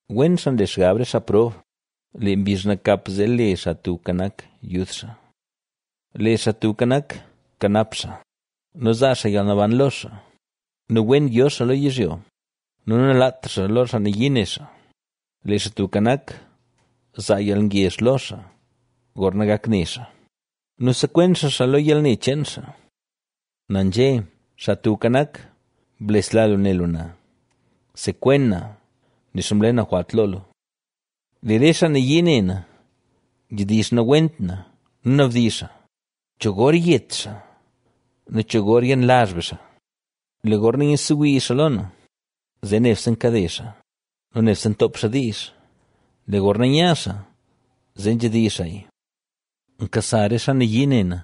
Wen xaa nle xgab re xaa prob; lee mbizh nakap zee le Xaa Tubka Nak yud xaa. Lee Xaa Tubka Nak kanap xaa nu zaa xaa yalnaban lo xaa nu wen yo xaa lo yizhyo nu nalaat xaa xaa lo xaa nayii ne xaa. Lee Xaa Tubka Nak, zaa yalngezh lo xaa gorna gak ne xaa nu sekwen xaa xaa lo yalne cheen xaa. Na nzhé: “Xaa Tubka Nak, blesla lu ne lu na; sekwen na, nixa mle na jwalt lo lu”. Lee re xaa nayii ne na, nzhedizh nawent na nu nabdizh xaa: “¿Cho gor yet xaa nu cho gor yenlazh be xaa”? Lee gorna nyiidsewii xaa lo na, zee nebse nkade xaa nu nebse ntoop xaa diizh, lee gorna nya xaa, zee nzhedizh xaaya. Nkasa re xaa nayii ne na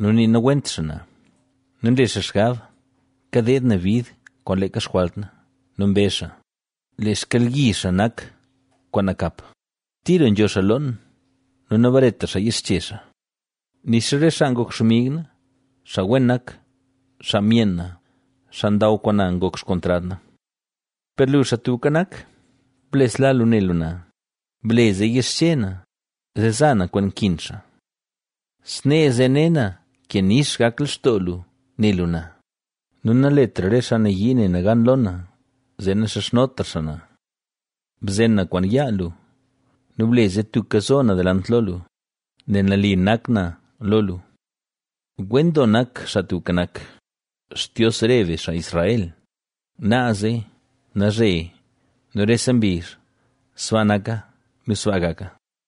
nu nii nawent xaa na nu nle xaa xgab kadeed na bid kwaan leeka xjwalt na nu mbezh xaa: “Lee xkyalyizh xaa nak kwaan nakap; tira nzho xaa loon nu nabaretra xaa yixche xaa.” Nixa re xaa ngok xmig na, xaa wen nak, xaa myenn na, xaa ndaw kwaan na ngok xkontrad na. Per lu, Xaa Tubka Nak, blesla lu ne lu na, ble zee yixche na, zee za na kwaan nkin xaa. Snee, zee ne na ke nix gak lextoo lu ne lu na, nu naletra re xaa nayii ne na gan lo na zee naxizhnotra xaa na. Bzen na kwaan yaa lu nu ble zee tubka zo na delant lo lu, nel nali nak na lo lu. ¡Wen doo nak, Xaa Tubka Nak, Xtios re be, xaa Israel, naaze, nalzhe nu rese mbizh! Sbaa naka nu sbaa gaka.